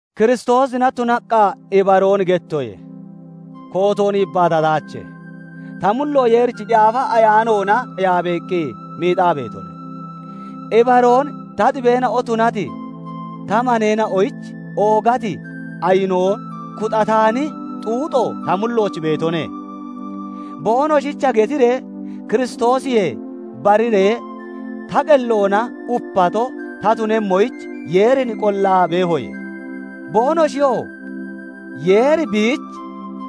Kiristoosina tunaqqa ibaroon gettoye; kootoon yibbaatataache; ta mullo Yeerichi Yaafa Ayaanoona yaabeeqqi miixaa beetone. Ibaroon ta xibeena'o tunati ta maneena'oyich oogati ayinoo, kuxataani xuuxoo ta mullooch beetone. Boonoshicha getiree Kiristoosiyee bariree ta qelloona upato ta tunemmoyich Yeerin qollaa beehoye. Boonoshiyoo Yeeri biich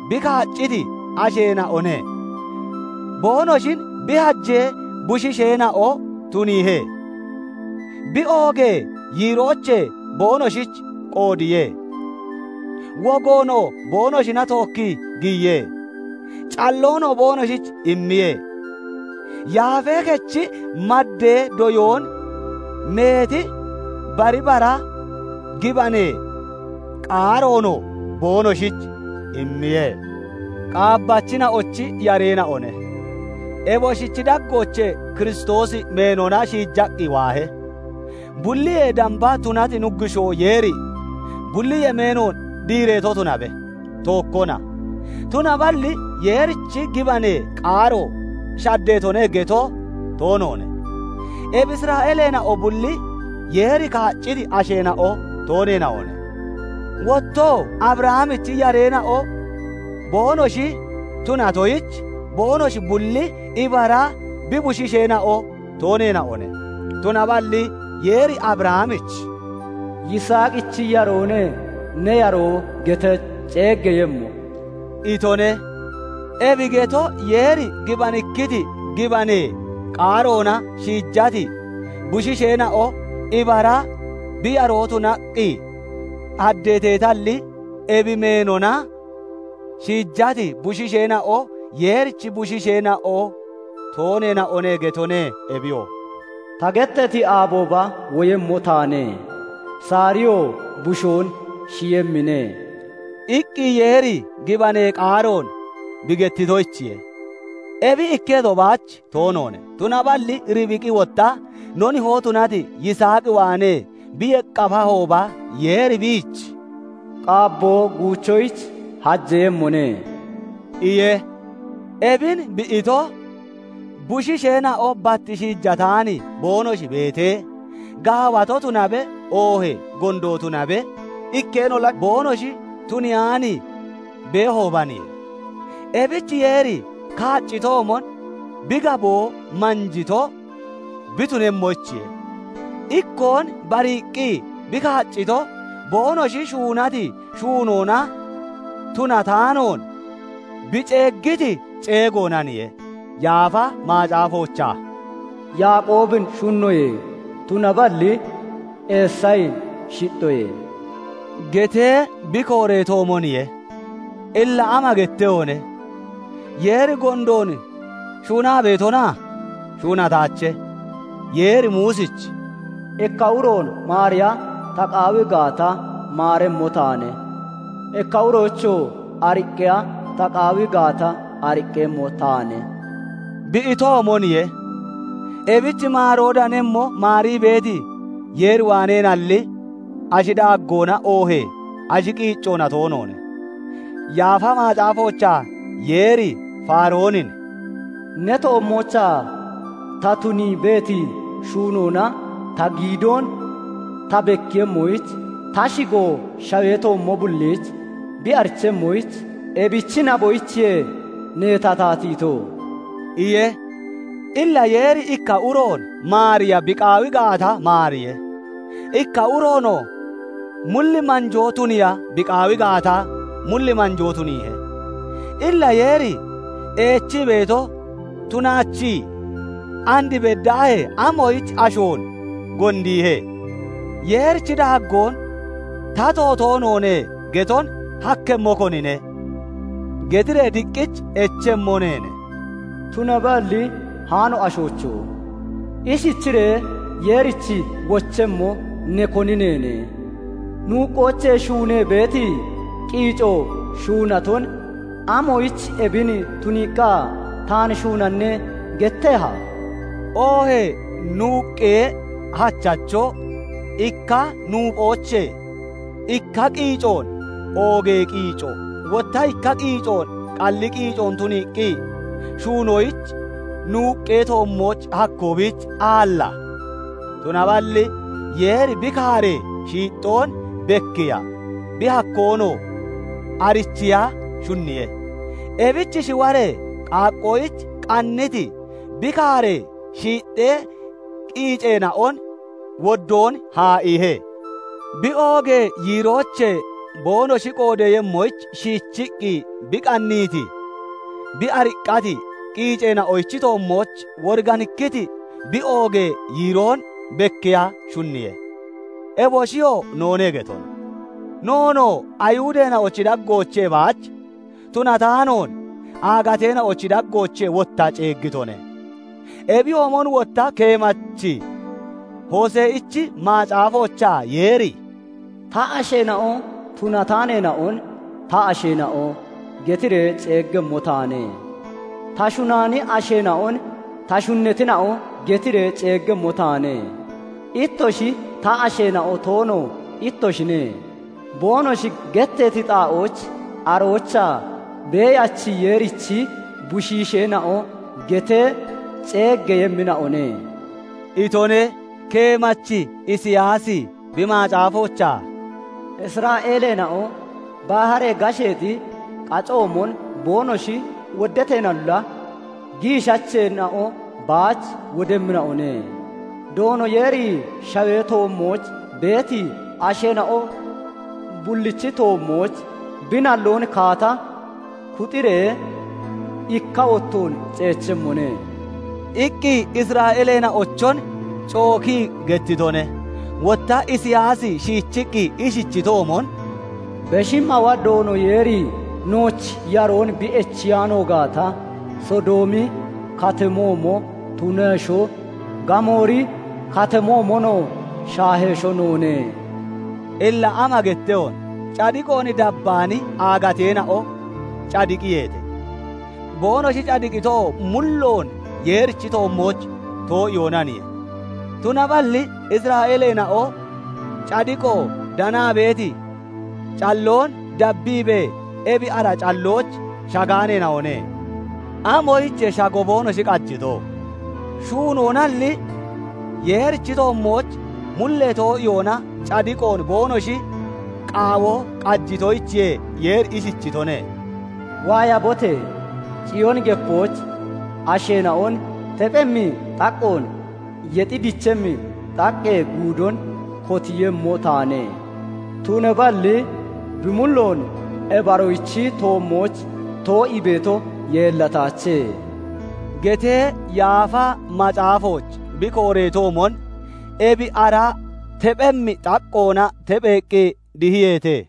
bi kaacciti asheena'one; boonoshin bi hajee bushiisheena'o tuniihe; bi oogee yiiroochee boonoshich qoodiye; wogoonoo boonoshina tookkii giyiye; calloonoo boonoshich immiye; yaafee kechi maddee doyoon, meeti bari bara gibanee qaaroonoo boonoshich immiye. Qaabbachina'ochi yareena'one; eboshichi daggoochee Kiristoosi meenona shiijaqqi waahe; bulliyee damba tunati Nuggushoo Yeeri bulli yemeenoon diireeto tunabe; tookkona. Tunaballi Yeerichi gibanee qaaro shaddeetone geto toonoone. Ebi Isra'eeleena'o bulli Yeeri kaacciti asheena'o tooneena'one. Wottoo Abrahamichi yareena'o boonoshi tunatoyich, boonoshi bulli ibara bi bushiisheena'o tooneena'one; tunaballi Yeeri Abrahamich "Yiisaaqichi yaroone ne yaroo getee ceeggeeyemmo" itone. Ebi geto Yeeri gibanikkiti gibanee qaaroona shiijati bushiisheena'o ibara bi yaroo tunaqqi haddeeteetalli, ebi meenona shiijati bushiisheena'o Yeerichi bushiisheena'o tooneena'one getone. Ebiyoo "Ta gettati aabooba woyemmo taane; Saariyoo bushoon shiyemmine" iqqi Yeeri gibanee qaaroon bi gettitoyichiye. Ebi ikketo baach toonoone; tunaballi Ribiqi wotta no nihoo tunati Yiisaaq waanee bi yeqqafahooba, Yeeri biich "Qaabboo guuchoyich hajeeyemmone" iye. Ebin bi ito bushiisheena'o bat shiijataani boonoshi beetee, gaawato tunabe, oohee gondo tunabe, ikkeenolla boonoshi tuniyaan beehoobaniye. Ebich Yeeri kaaccitoomon bi gaboo manjito bi tunemmoyich, ikkoon bariiqqi bi kaaccito boonoshi shuunati shuunoona tunataanoon, bi ceeggiti ceegoonaniye. Yaafa Macaafoochaa "Yaaqoobin shunnoye; tunaballi Eesayin shixxoye" getee bi kooreetoomoniye. Illa ama gettehone? Yeeri gondoon shuunaa beetona? Shuunataache. Yeeri Muusich "Ikka uroon maariya ta qaawi gaata, maaremmo taane; ikka uroyichoo ariqqiya ta qaawi gaata, ariqqemmo taane" bi itoomoniye. Ebich maaroo danemmo maarii beeti Yeer waaneenalli, ashi daaggoona oohee ashi qiiccoona toonoone. Yaafa Macaafoochaa Yeeri Faaroonin "Ne toommoochaa ta tunii beeti shuunoona ta giidoon ta bekkiiyemmoyich, ta shigoo shawee toommo bulliich bi arichemmoyich, ebichi naboyichiye neen ta taatiito" iye. Illa Yeeri ikka uroon maariya bi qaawi gaata, maariye; ikka uroonoo mulli manjoo tuniiya bi qaawi gaata, mulli manjoo tuniihe. Illa Yeeri eechii beeto tunaachii, "And beddaahee amoyich ashoon gondiihe? Yeerichi daaggoon 'Tato toonoone' geton hakkemmo, konine?" getiree diqqich echemmo neene. Tunaballi haano ashoocho! Ishichiree Yeerich wochemmo ne koni neene? Nuuqqoochee shuunee beeti qiico shuunaton "Amoyich ebin tuniiqqa taan shuunanne?" getteha? Oohee nuuqqee hachacho ikka nuuphoochee ikka qiicoon oogee qiico, wotta ikka qiicoon qalli qiicoon tuniiqqi shuunoyich nuuqqee toommooch hakkoo biich aalla? Tunaballi Yeeri bi kaaree shiixxoon bekkiiya, bi hakkoonoo arichiiya shunniye; ebich shiwaree qaaqqoyich qanniti bi kaaree shiixxee qiiceena'on woddoon haa'iihe. Bi oogee yiiroochee boonoshi qoodeeyemmoyich shiichiqqi bi qanniiti, bi ariqqati qiiceena'ochi toommooch woriganikkiti bi oogee yiiroon bekkiiya shunniye. Eboshiyoo noone getone; noonoo Ayihudeena'ochi daggoochee baach tunataanoon, aagateena'ochi daggoochee wotta ceeggitone. Ebiyoomon wotta keemachi Hose'ichi Macaafoochaa Yeeri "Ta asheena'o tunataaneena'on 'Ta asheena'o' getiree ceeggemmo taane; ta shunaani asheena'on 'Ta shunnatina'o' getiree ceeggemmo taane. 'Ittoshi ta asheena'o toono ittoshine' boonoshi getteeti xaa'ooch aroochaa 'Beeyachi Yeerichi bushiisheena'o' getee ceeggeeyemmina'one" itone. Keemachi Isiyaasi bi macaafoochaa "Isra'eeleena'o baharee gasheexi qacoomon boonoshi woddateenolla, giishacheena'o baach wodemmina'one; Doono Yeeri shawee toommooch beeti asheena'o bullichi toommooch bi nalloon kaata kuxiree ikka wottoon ceechemmone" iqqi Isra'eeleena'ochon cookii gettitone. Wotta Isiyaasi shiichiqqi ishichitoomon, "Beshi Mawa Doono Yeeri nooch yaroon bi echiyaano gaata, Sodoomi Katamoomo tunesho, Gamoori Katamoomonoo shaahesho noone." Illa ama gettehone? Cadiqoon dabbaani aagateena'o cadiqiyeete; boonoshi cadiqitoo mulloon Yeerichi toommooch too'iyoonaniye. Tunaballi Isra'eeleena'o cadiqo danaa beeti calloon dabbiibee ebi ara callooch shagaaneena'one. Amoyichiye shago boonoshi qajito? Shuunoonalli, Yeerichi toommooch mullee too'iyoona cadiqoon boonoshi qaawo qajitoyichiye; Yeeri ishichitone:- "Waayabote! Ciyooni Gepooch asheena'on tephemmi xaqqoon, yexi dichemmi xaqqee guudoon kotiiyemmo taane; tunaballi bi mulloon ebi aroochi toommooch too'ii beeto yeellataache" getee Yaafa Macaafooch bi kooreetoomon ebi ara tephemmi xaqqoona tepheeqqi dihiyeete.